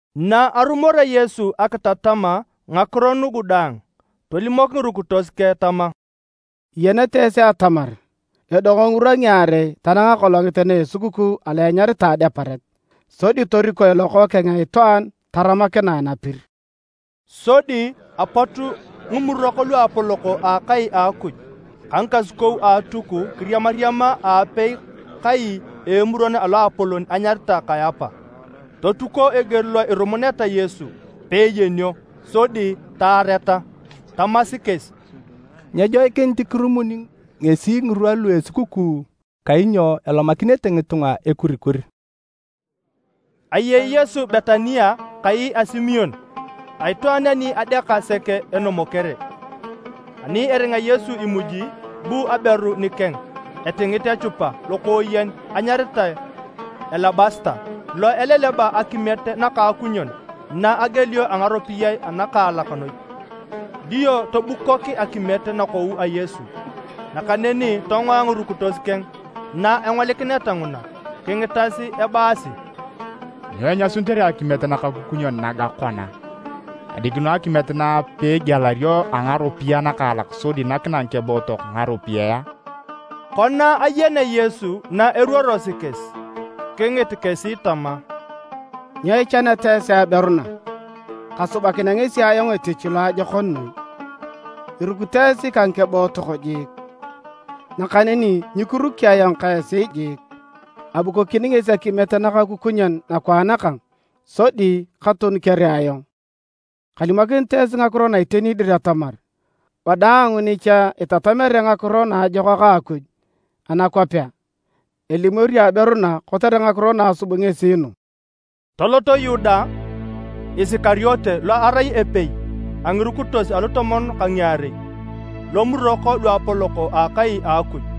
Na arumorea Yesu akitatam ngakiro nugu daang, tolimok ngirukitos keng tama, “Iyenete esi atamar edong ngirwa ngiarei tanang akolongit na esukukuu alo enyaritae Adeparet, sodi torikoe Lokookeng a Itwaan taramakinae napir.” Sodi apot ngimurok luapolok a akai a Akuj ka ngikasukou a Atuk kiriamariama aapei kai a Emuron a Loapolon enyaritae Kayapa, totuko eger lo irumuneta Yesu peeyenio sodi taareta. Tamasi kesi, “Nyejoikinit kirumuni ngesi ngirwa lu esukukuu kainyo elomakinete ngitunga ekurikur.” Ayei Yesu Betania kai a Simon, a itwaan ani adeaka sek enomokere. Ani eringa Yesu imuji, bu aberu nikeng etingit echupa lokooyen enyaritae alabasita lo ileleba akimiet nakaakunyon na egielio a ngaropiyae anakaalak noi, dio tobukok akimiet nakou a Yesu. Nakaneni tongoa ngirukitos keng na engolikineta nguna. Kingitas ebaasi, “Nyo inyasunitere akimiet nakaakunyon naga kona? Adikino akimiet na peegielario a ngaropiyae anakaalak sodi nakinae ngikebootok ngaropiyae a?” Kona ayenea Yesu na eruorosi kesi, kingit kesi tama, “Nyo ichaneta esi aberu na? Kasubakinea ngesi ayong etich loajokon noi. Irukito esi ka ngikebootok jiik, nakaneni nyikiruki ayong ka esi jiik. Abukokini ngesi akimiet nakaakunyon nakwaan kang sodi katonukere ayong. Kalimokinit esi ngakiro na iteni atamar, wadaang ni cha itatamere Ngakiro Naajokak a Akuj anakwapea, elimorio aberu na kotere ngakiro na asub ngesi nu.” Tolot Yuda Isikariote lo erai epei a ngirukitos alutomon ka ngiarei lomurok luapolok a akai a Akuj,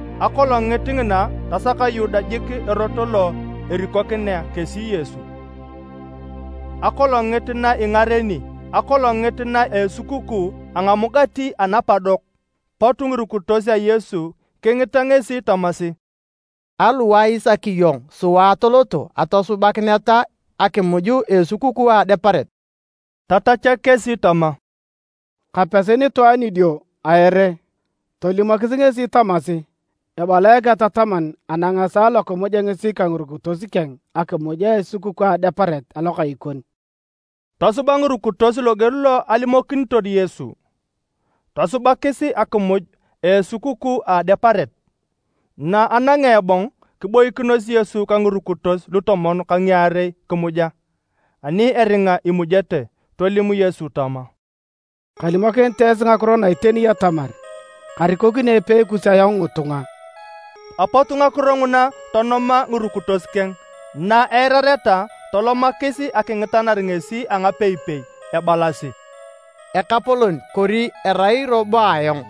Akolongit ngina tasak Yuda jik erot lo erikokinea kesi Yesu. Akolongit na ingareni akolongit na esukukuu a Ngamugati Anapadok, pot ngirukitos a Yesu kingita ngesi tamasi, “Aliwae isaki iyong sua atoloto atosubakineta akimuj a esukukuu a Adeparet?” Tatachak kesi tama, “Kapesi nitwaan idio a ere, tolimokis ngesi tamasi, ‘Ebala Eketataman anang esaa lokimuja ngesi ka ngirukitos keng akimuj a esukukuu a Adeparet alokai kon.’” Tosuba ngirukitos loger lo alimokinitor Yesu, tosubakis akimuj a esukukuu a Adeparet. Na anangea ebong, kiboikinos Yesu ka ngirukitos lutomon ka ngiarei kimuja. Ani eringa imujete, tolim Yesu tama, “Kalimokinit esi ngakiro na iteni atamar, karikokini epei kus ayong ngitunga.” Apot ngakiro nguna tonoma ngirukitos keng na eirareta tolomakis akingitanar ngesi a ngapeipei ebalasi, “Ekapolon! Kori erai robo ayong?”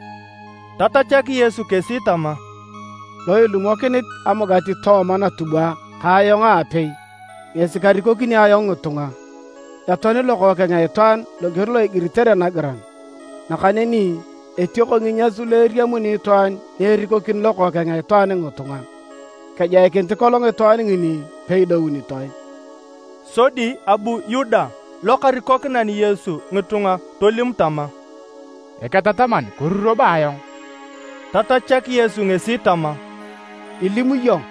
Tatachak Yesu kesi tama, “Lo ilumokinit amugati tooma natubwa ka ayong aapei ngesi karikokini ayong ngitunga. Etoani Lokookeng a Itwaan loger lo igiritere nagiran, nakaneni etioko nginyas lu eriamuni itwaan ni erikokini Lokookeng a Itwaan ngitunga! Kejoikinit kolong itwaan ngini peidounitoe!” Sodi abu Yuda lokarikokinan Yesu ngitunga tolim tama, “Eketataman, kori robo ayong?” Tatachak Yesu ngesi tama, “Ilim iyong.”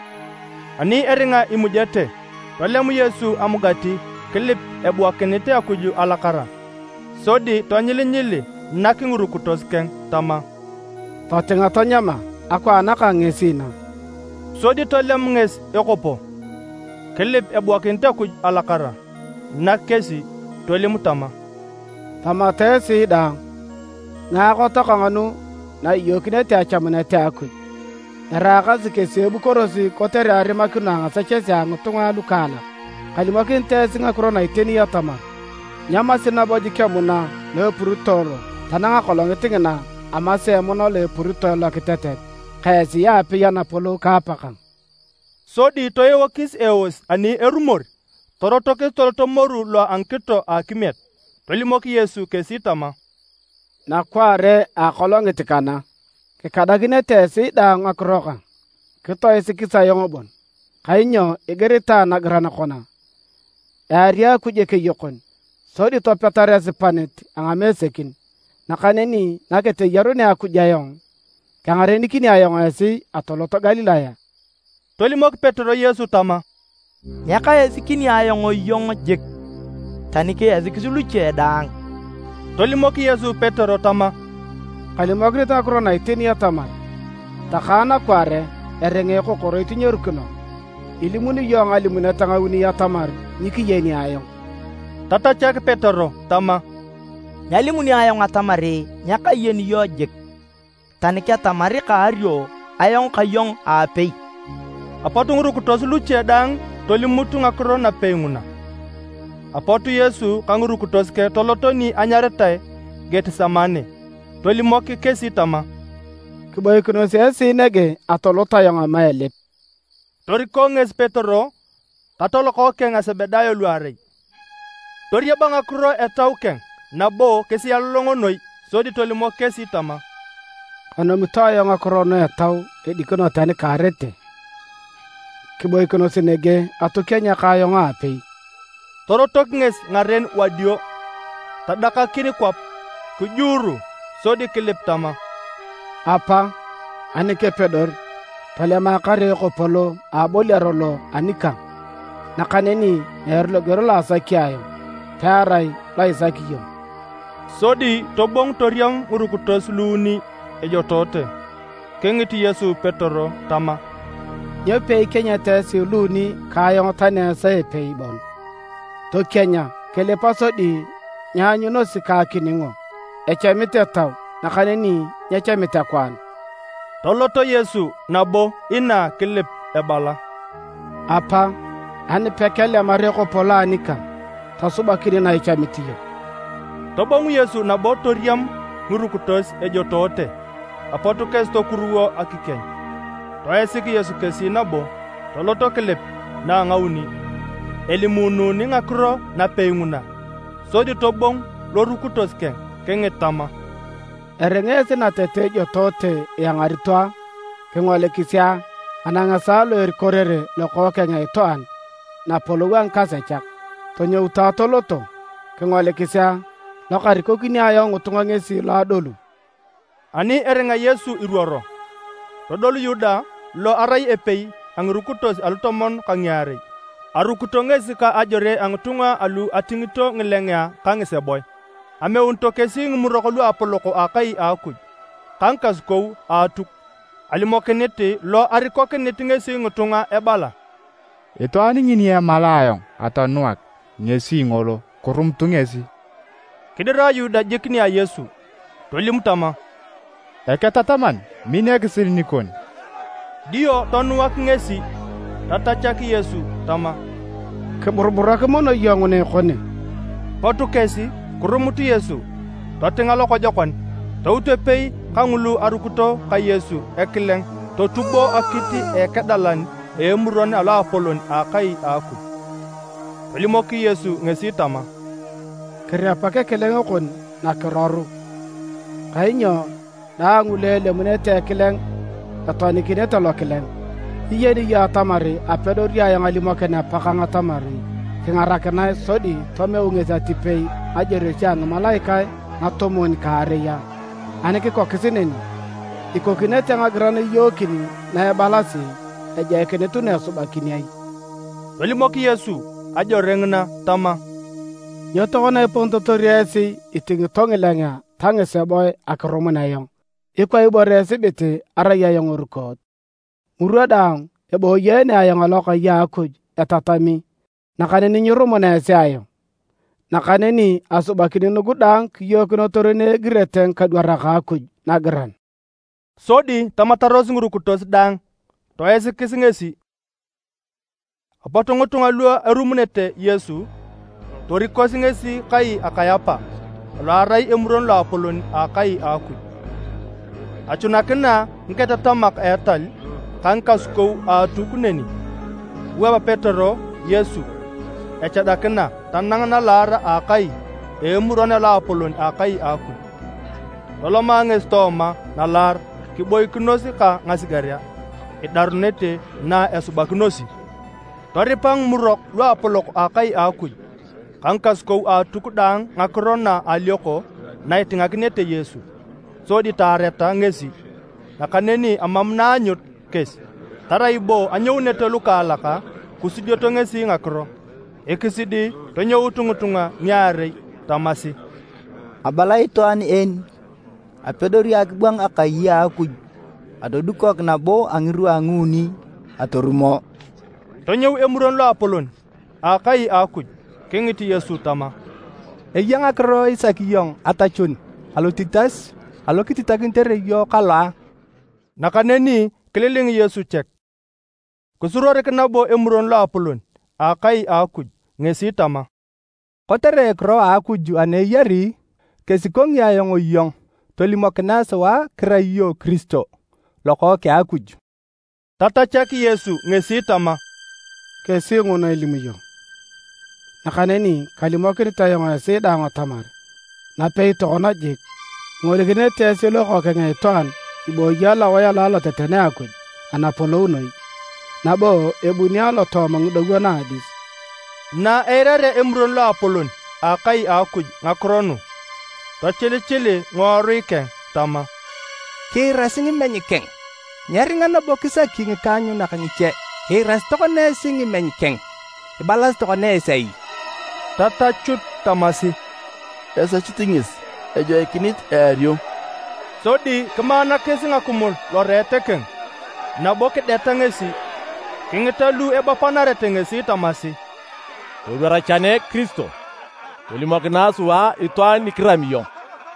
Ani eringa imujete, tolem Yesu amugati kilip ebuakinit Akuj alakara, sodi tonyilinyili, nak ngirukitos keng tama, “Totinga tanyama, akwaan kang ngesi na.” Sodi tolem ngesi ekopo, kilip ebuakinit Akuj alakara, nak kesi. Tolim tama, “Tamata esi daang. Ngaakot kang nu na iyookinete achamunet a Akuj, eraakasi kesi ebukorosi kotere arimakino a ngasechesea a ngitunga alukaalak. Kalimokinit esi ngakiro na iteni atamar, nyamasi nabo jik emuna lo epuritoe lo tanang akolongit ngina amasea emuna lo epuritoe lokitetet ka esi aapei Anapolou ka Apakang.” Sodi toeokis eos ani erumor, torotokis toloto moru lo a ngikito a akimiet. Tolimok Yesu kesi tama, “Nakwaare a akolongit kana, kikadakinete esi daang ngakiro kang, kitoisikis ayong bon, kainyo igiritae nagiran kona, ‘Eari Akuj ekeyokon, sodi topetar esipanit a ngamesekin.’ Nakaneni naketeyarunea Akuj ayong, kengarenikini ayong esi atolot Galilaya.” Tolimok Petero Yesu tama, “Nyekaisikini ayong iyong jik, tani kiisikis luche daang!” Tolimok Yesu Petero tama, “Kalimokinit ngakiro na iteni atamar, takae nakwaare, eringa ekokoroit nyerukino, ilimuni iyong ngalimunet ngauni atamar nyikiyeni ayong.” Tatachak Petero tama, “Nyalimuni ayong atamar nyakayeni iyong jik, tani ketamar kaario ayong ka iyong aapei!” Apot ngirukitos luche daang tolimut ngakiro napei nguna. Apot Yesu ka ngirukitos keng toloto ni anyaritae Getisemane, tolimok kesi tama, “Kiboikinos esi nege atolot ayong ama elip.” Toriko ngesi Petero ka talokookeng a Sebedayo luarei. Toriaba ngakiro etau keng nabo kisialolongo noi. Sodi tolimok kesi tama, “Kanomito ayong ngakiro nu etau edikino tani kaarete! Kiboikinos nege atokienya ka ayong aapei.” Torotok ngesi ngaren wadio, tadakakin kwap kijuuru, sodi kilip tama, “Apa, ani kepedor, tolema kare ekopo lo aboliaro lo anikang, nakaneni meere loger lo asaki ayong, pearai lo isaki iyong.” Sodi tobongu toriam ngirukitos luuni ejotoote, kingit Yesu Petero tama, “Nyo peikienyeta esi luuni ka ayong tani a esaa a epei bon? Tokienya, kilipa sodi nyianyunosi ka akiningo. Echamit etau nakaneni nyechamit akwaan.” Tolot Yesu nabo inaa kilip ebala, “Apa, ani pekelemar ekopo lo anikang, tosubakin na ichamit iyong.” Tobongu Yesu nabo toriam ngirukitos ejotoote. Apot kesi tokuruwo akikieny. Toisik Yesu kesi nabo, tolot kilip na a ngauni, elimuununi ngakiro napei nguna. Sodi tobongu lorukitos keng kingit tama, “Eringa esi natete ijotoote iangarito a? Kingolikisi a! Anang esaa lo erikorere tokona Lokookeng a Itwaan napolou a ngikasechak. Tonyoutu atoloto. Kingolikisi a! Lokarikokini ayong ngitunga ngesi lo adolu.” Ani eringa Yesu iruoro, todol Yuda lo erai epei a ngirukitos alutomon ka ngiarei. Arukito ngesi ka ajore a ngitunga alu atingito ngilengea ka ngiseboe. Ameunito kesi ngimurok luapolok a akai a Akuj ka ngikasukou a Atuk. Alimokinit lo arikokinit ngesi ngitunga ebala, “Itwaan ngini emalae ayong atonuak, ngesi ngolo, kirumutu ngesi!” Kidira Yuda jik nia Yesu tolim tama, “Eketataman, min ekisil nikon, dio tonuak ngesi.” Tatachak Yesu tama, “Kiburuburak mono iyong nguna ekone!” Pot kesi kirumut Yesu totinga lokojokon. Tout epei kangulu arukito ka Yesu ekileng totubo akit a ekedalan a Emuron a Loapolon a akai a Akuj. Tolimok Yesu ngesi tama, “Kirepak ekileng kon nakiroru, kainyo daang lu elemunete ekileng etoanikinete lokileng. Nyiyeni iyong atamar apedori ayong alimokin Apakang atamar kingarakinae sodi tomeu ngesi atipei ngajoresio a ngimalaikae ngatomon ka ngaarei a? Ani kikokis neni, ikokinete ngagiran iyookin na ebalasi, ejoikinit nu esubakin ai?” Tolimok Yesu ajore ngina tama, “Nyo tokona iponitotor esi itingito ngilengea ta ngiseboe akirumun ayong ikwa ibore esibit arai ayong erukoot? Ngirwa daang eboyeene ayong alokai a Akuj etatami nakaneni nyirumuna esi ayong. Nakaneni asubakin nugu daang kiyookinotor na egirete ngikadwarak a Akuj nagiran.” Sodi tamataros ngirukitos daang toisikis ngesi. Apot ngitunga lu erumunete Yesu torikosi ngesi kai a Kayapa alo arai Emuron Loapolon a akai a Akuj. Achunakina ngiketatamak a etal ka ngikasukou a Atuk neni. Kiwap Petero Yesu echadakina tanang nalaar a akai a Emuron a Loapolon a akai a Akuj. Toloma ngesi tooma nalaar kiboikinos ka ngasigerea, idarunit na esubakinosi. Toripa ngimurok luapolok a akai a Akuj ka ngikasukou a Atuk daang ngakiro na alioko na itinganakinete Yesu, sodi taareta ngesi. Nakaneni emam na aanyut kesi, tarai bo anyounete lukaalak kisudioto ngesi ngakiro. Ekisidi tonyout ngitunga ngiarei tamasi, “Abala itwaan en, apedori akibwang akai a Akuj atodukok nabo a ngirwa nguuni atorumo.” Tonyou Emuron Loapolon a akai a Akuj kingit Yesu tama, “Eya ngakiro isaki iyong atachun alotitas alo kititakinitere iyong kalo a?” Nakaneni kililing Yesu chek. Kisuruorik nabo Emuron Loapolon a akai a Akuj ngesi tama, “Kotere ekiro a Akuj ana eyari, kesikongi ayong iyong, tolimokinae sua kirai iyong Kiristo, Lokookeng a Akuj.” Tatachak Yesu ngesi tama, “Kesi nguna ilimu iyong. Nakaneni kalimokinit ayong esi daang atamar, napei tokona jik, ingolikinete esi Lokookeng a Itwaan ibooyi alowae alo aloteten a Akuj Anaapolon Noi, nabo ebuni alotooma ngidowon a Adis.” Na eirarea Emuron Loapolon a akai a Akuj ngakiro nu, tochilichili ngiworui keng tama, “Kiirasi ngimeny keng! Nyeringa nabo kisaki ngikaanyunak ngiche! Iirasi tokona esi ngimeny keng. Ibalasi tokona esi ai?” Tatachut tamasi, “Esechit ngesi, ejoikinit eario.” Sodi kimaanakis ngakimul loreet keng, nabo kideta ngesi. Kingita lu ebapanarete ngesi tamasi, “Todwar chene Kiristo! Tolimokinae sua itwaan ni kirami iyong!”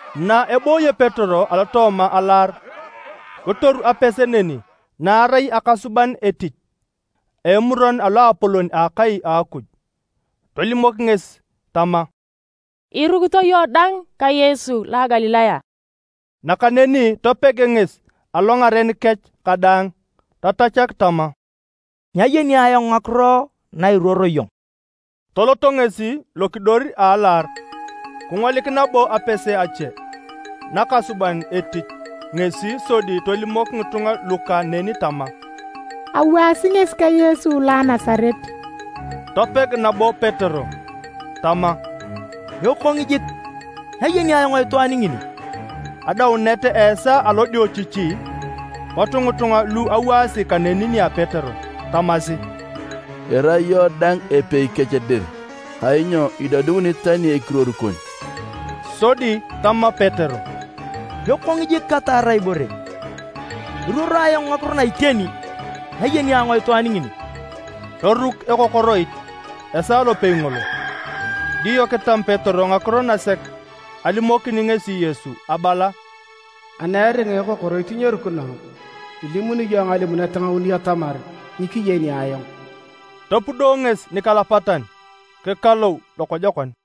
Na ebooyo Petero alotooma alaar, kitoru apese neni na arai akasuban etich a Emuron a Loapolon a akai a Akuj, tolimok ngesi tama, “Irukito iyong dang ka Yesu lo a Galilaya?” Nakaneni topeg ngesi alongaren kech kadaang. Tatachak tama, “Nyayeni ayong ngakiro na iruoro iyong.” Tolot ngesi lokidor a alaar. Kingolik nabo apese ache nakasuban etich ngesi sodi tolimok ngitunga luka neni tama, “Awaasi ngesi ka Yesu lo a Nasaret.” Topeg nabo Petero tama, “Ekong jik, nyayeni ayong itwaan ngini!” Adaunet a esaa alodiochichi, pot ngitunga lu awaasi kaneni nia Petero tamasi, “Irai iyong dang epei kech dir, kainyo idodiunit tani ekiruor kon.” Sodi tama Petero, “Ekong jik kataar ibore, eruoro ayong ngakiro na iteni! Nyayeni ayong itwaan ngini.” Toruk ekokoroit esaa lopei ngolo. Dio kitam Petero ngakiro nasek alimokinit ngesi Yesu Abala: “Ani eringa ekokoroit nyerukino, ilimuni iyong ngalimunet ngauni atamar nyikiyeni ayong.” Topudo ngesi nikalapatan, kikalou lokojokon.